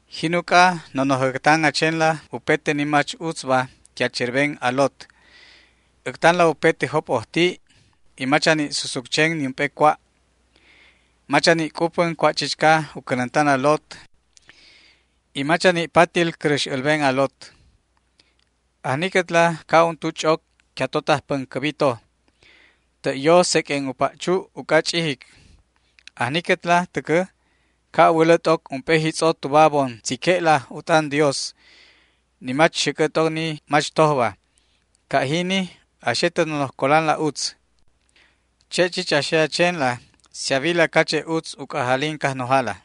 Jin uc'a, nonoj äctan a chenla upete ni mach utzba que a cherben a lot. Äctanla upete jop'ojti' y mach a ni' susuc chen niump'e cua'. Mach a ni' c'upän cua' chichca u cänäntan a lot y mach a ni' patil cäräx älben a lot. Ajniquetla ca' untu ch'oc que atotaj päncäbi to. Tä' yo seq'uen u pa' chu' uc'a ch'ijic. Ajniquetla täcä ca' a wälä t'oc ump'e jitz'o tuba a bon tzique'la u t'an Dios, ni mach xäc'ä t'oc ni mach tojba. Ca' jini a xe tä nonoj colanla utz. Che' chich a xe a chenla si a wila cache' utz u c'ajalin Cajnojala.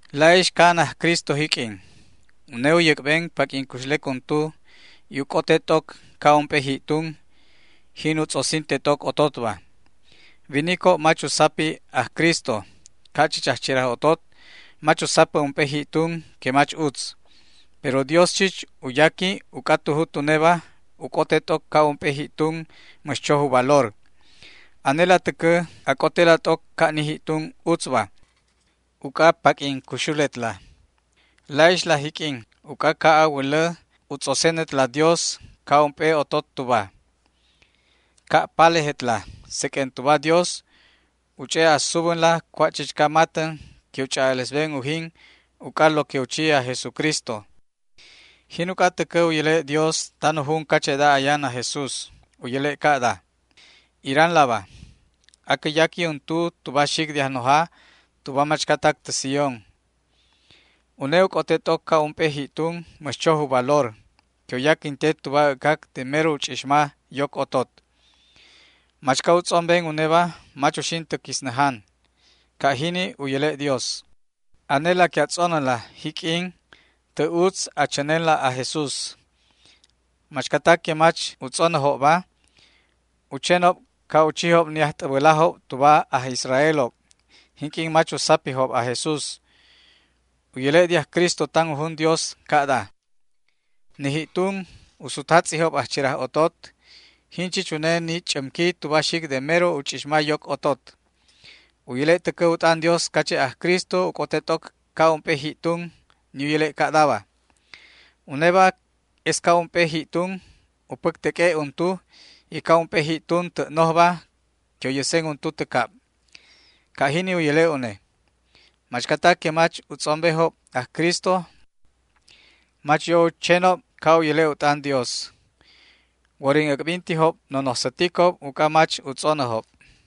La'ixla ca'an aj Cristo jiq'uin. Une u yäc'ben paq'uin cuxlec untu y u c'ote t'oc ca' ump'e ji'tun, jin u tz'osinte t'oc ototba. Winicob mach u sapi aj Cristo, ca' chich ajcheraj otot mach u sapä ump'e ji'tun que mach utz. Pero Dios chich u yaqui uc'a tu jut uneba u c'ote t'oc ca' ump'e ji'tun mäx choj u valor. Anela täcä a c'otela t'oc ca' ni ji'tun utzba, uc'a paq'uin cuxuletla. La'ixla jiq'uin, uc'a ca' a wälä u tz'osenetla Dios ca' ump'e otot tuba. Ca' palejetla seq'uen tuba Dios u ch'e' a subänla cua' chichca matän que u ch'a'alesben ujin uc'a lo que u chi aj Jesucristo. Jin uc'a täcä u yäle' Dios tan u jun cache'da ayan aj Jesús. U yäle' ca'da: Iranlaba, acä yaqui untu tuba xic de Ajnoja tuba machcatac tä Sión. Une u c'ote t'oc ca' ump'e ji'tun mäx choj u valor que u yaquinte tuba äc'cac de mero u ch'ixma yoc otot. Machca u tz'omben uneba mach uxin tä quisnäjan. Ca' jini u yäle' Dios. Anela que a tz'onänla, jiq'uin, tä' utz a chänenla aj Jesús. Machcatac que mach u tz'onäjobba u chenob ca' u chijob ni ajt'äbälajob tuba aj Israeljob jinq'uin mach u sapijob aj Jesús. U yäle' de aj Cristo tan u jun Dios ca'da: Ni ji'tun u sutjatz'ijob ajcheraj ototob, jin chich une ni ch'ämqui tuba xic de mero u ch'ixma yoc otot. U yäle' täcä u t'an Dios cache' aj Cristo u c'ote t'oc ca' ump'e ji'tun, ni u yäle' ca'daba: Uneba es ca' ump'e ji'tun u päcteq'ue' untu y ca' ump'e ji'tun tä' nojba que u yäsen untu tä cab. Ca' jini u yäle' une. Machcatac que mach u tz'ombejob aj Cristo mach yo u chenob ca' u yäle' u t'an Dios. Worin äc'bintijob nonoj säticob uc'a mach u tz'onäjob.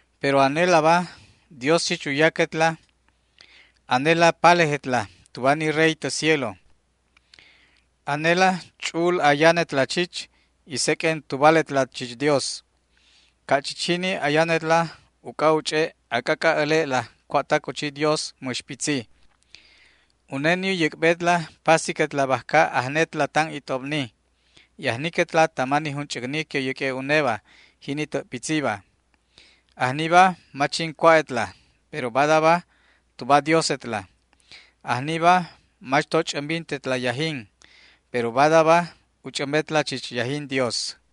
Pero anelaba Dios chich u yaquetla, anela palejetla tuba ni Rey tä cielo, anela ch'u'ul ayanetla chich y seq'uen tubaletla chich Dios. Ca' chich jini ayanetla uc'a u ch'e' a c'ac'a' äle'la cua'tac u chi Dios mäx pitzi. Une ni u yäc'betla pasiquetla bajca ajnetla tan it'obni y ajniquetla tama ni junch'äcni que u yäq'ue' uneba, jini tä' pitziba. Ajniba mach jin cua'etla, pero badaba tuba Diosetla. Ajniba mach to ch'ämbintetla yajin, pero badaba u ch'ämbetla chich yajin Dios.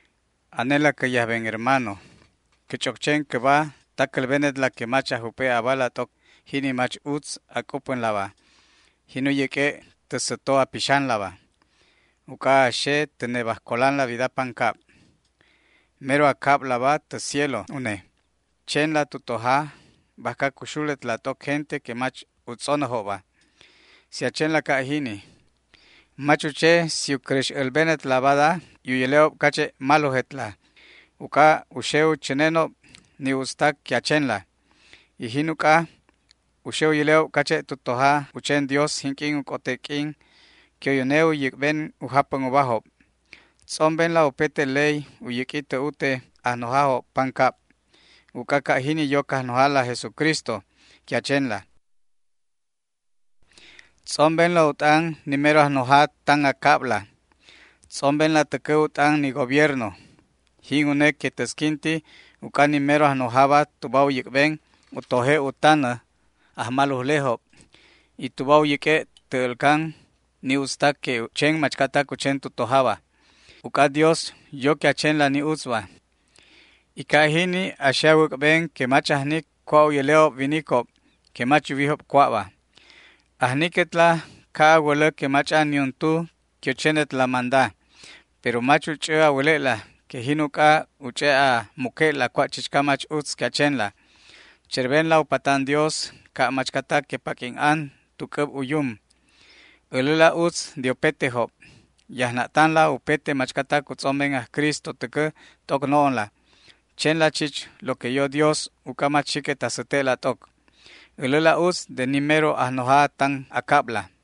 Anela cä yajben hermano, cä ch'oc chen cäba ta cälbenetla que mach a jup'e' abala t'oc jini mach utz a c'upänlaba, jin u yäq'ue' tä säto a pixanlaba. Uc'a a xe tä nebaj colanla wida pancab. Mero a cablaba tä cielo une. Chenla tu toja bajca cuxuletla t'oc gente que mach u tz'onäjobba. Si a chenla ca' jini, mach u che si u cäräx älbenetla bada y u yäle'ob cache' malojetla, uc'a u xe u chänenob ni utztac que a chenla. Y jin uc'a u xe u yäle'ob cache' tu toja u chen Dios jinq'uin u c'ote q'uin que une u yäc'ben u japän ubajob. Tz'ombenla upete ley u yäq'ui tä ute ajnojajob pancab, uc'a ca' jini yo Cajnojala aj Jesucristo que a chenla. Tz'ombenla u t'an ni mero ajnoja tan a cabla. Tz'ombenla täcä u t'an ni gobierno, jin une que täsquinti uc'a ni mero ajnojaba tuba u yäc'ben u toje' u tanä ajmalujlejob y tuba u yäq'ue' tä älcan ni utztac que u chen machcatac u chen tu tojaba. Uc'a Dios yo que a chenla ni utzba, y ca' jini a xe a wäc'ben que mach ajnic cua' u yäle'ob winicob que mach yuwijob cua'ba. Ajniquetla ca' a wälä que mach'an niuntu que u chenetla manda, pero mach u ch'ä a wäle'la que jin uc'a u ch'e' a muque'la cua' chichca mach utz que a chenla. Cherbenla u patan Dios ca' machcatac que paq'uin an tu c'äb u yum. Äläla utz de upetejob. Yajna'tanla upete machcatac u tz'omben aj Cristo täcä t'oc no'onla. Chenla chich lo que yo Dios uc'a mach xiquet a säte'la t'oc. Äläla utz de ni mero ajnoja tan a cabla.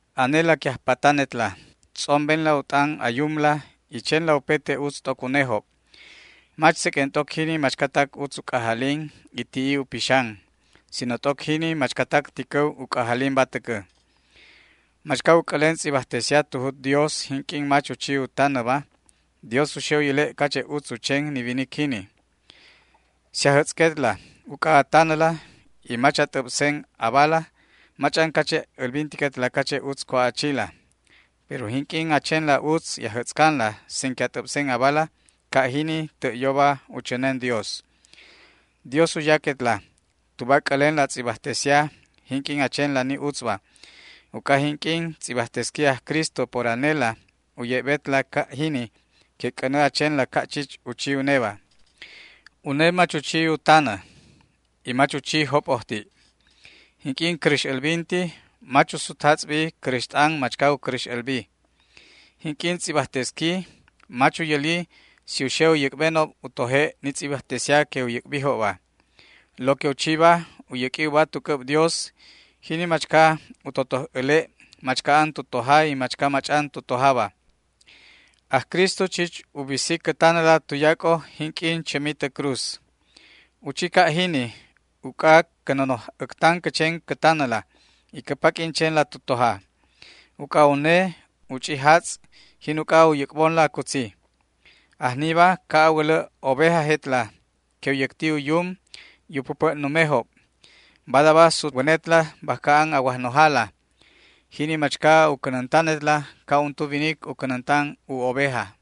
Anela que ajpatanetla, tz'ombenla u t'an a yumla y chenla upete utz t'oc unejob, mach seq'uen t'oc jini machcatac utz u c'ajalin y ti'i u pixan, sino t'oc jini machcatac ticäw u c'ajalinba täcä. Machca u c'älen tz'ibajtesia tu jut Dios jinq'uin mach u chi u tanäba, Dios u xe u yäle' cache' utz u chen ni winic jini. Si ajätz'quetla uc'a a tanäla y mach a t'äbsen abala mach'an cache' älbintiquetla cache' utz cua' a chila, pero jinq'uin a chenla utz y a jätz'canla sin que a t'äbsen abala, ca' jini tä' yoba u chänen Dios. Dios u yaquetla tuba a c'älenla tz'ibajtesia jinq'uin a chenla ni utzba, uc'a jinq'uin tz'ibajtesqui aj Cristo por anela u ye'betla ca' jini que c'änä a chenla ca' chich u chi uneba. Une mach u chi u tanä, y mach u chi jop'ojti'. Jinq'uin cäräx älbinti mach u sutatz'bi cräxt'an machca u cäräx älbi. Jinq'uin tz'ibajtesqui mach u yäli si u xe u yäc'benob u toje' ni tz'ibajtesia que u yäc'bijobba. Lo que u chiba, u yäq'ui uba tu c'äb Dios, jini machca u totoj äle' machca an tu toja y machca mach'an tu tojaba. Aj Cristo chich u bisi cä tanäla tuyac'o jinq'uin chämi tä cruz. U chi ca' jini uc'a cä nonoj äctan cä chen cä tanäla y cä paq'uin chenla tu toja. Uc'a une u ch'i jatz', jin uc'a u yäc'bonla cutzi. Ajniba ca' a wälä ovejajetla que u yäcti u yum y u päpä' numejob. Badaba sutwänetla bajca an a Wajnojala, jini machca u cänäntanetla ca' untu winic u cänäntan u oveja.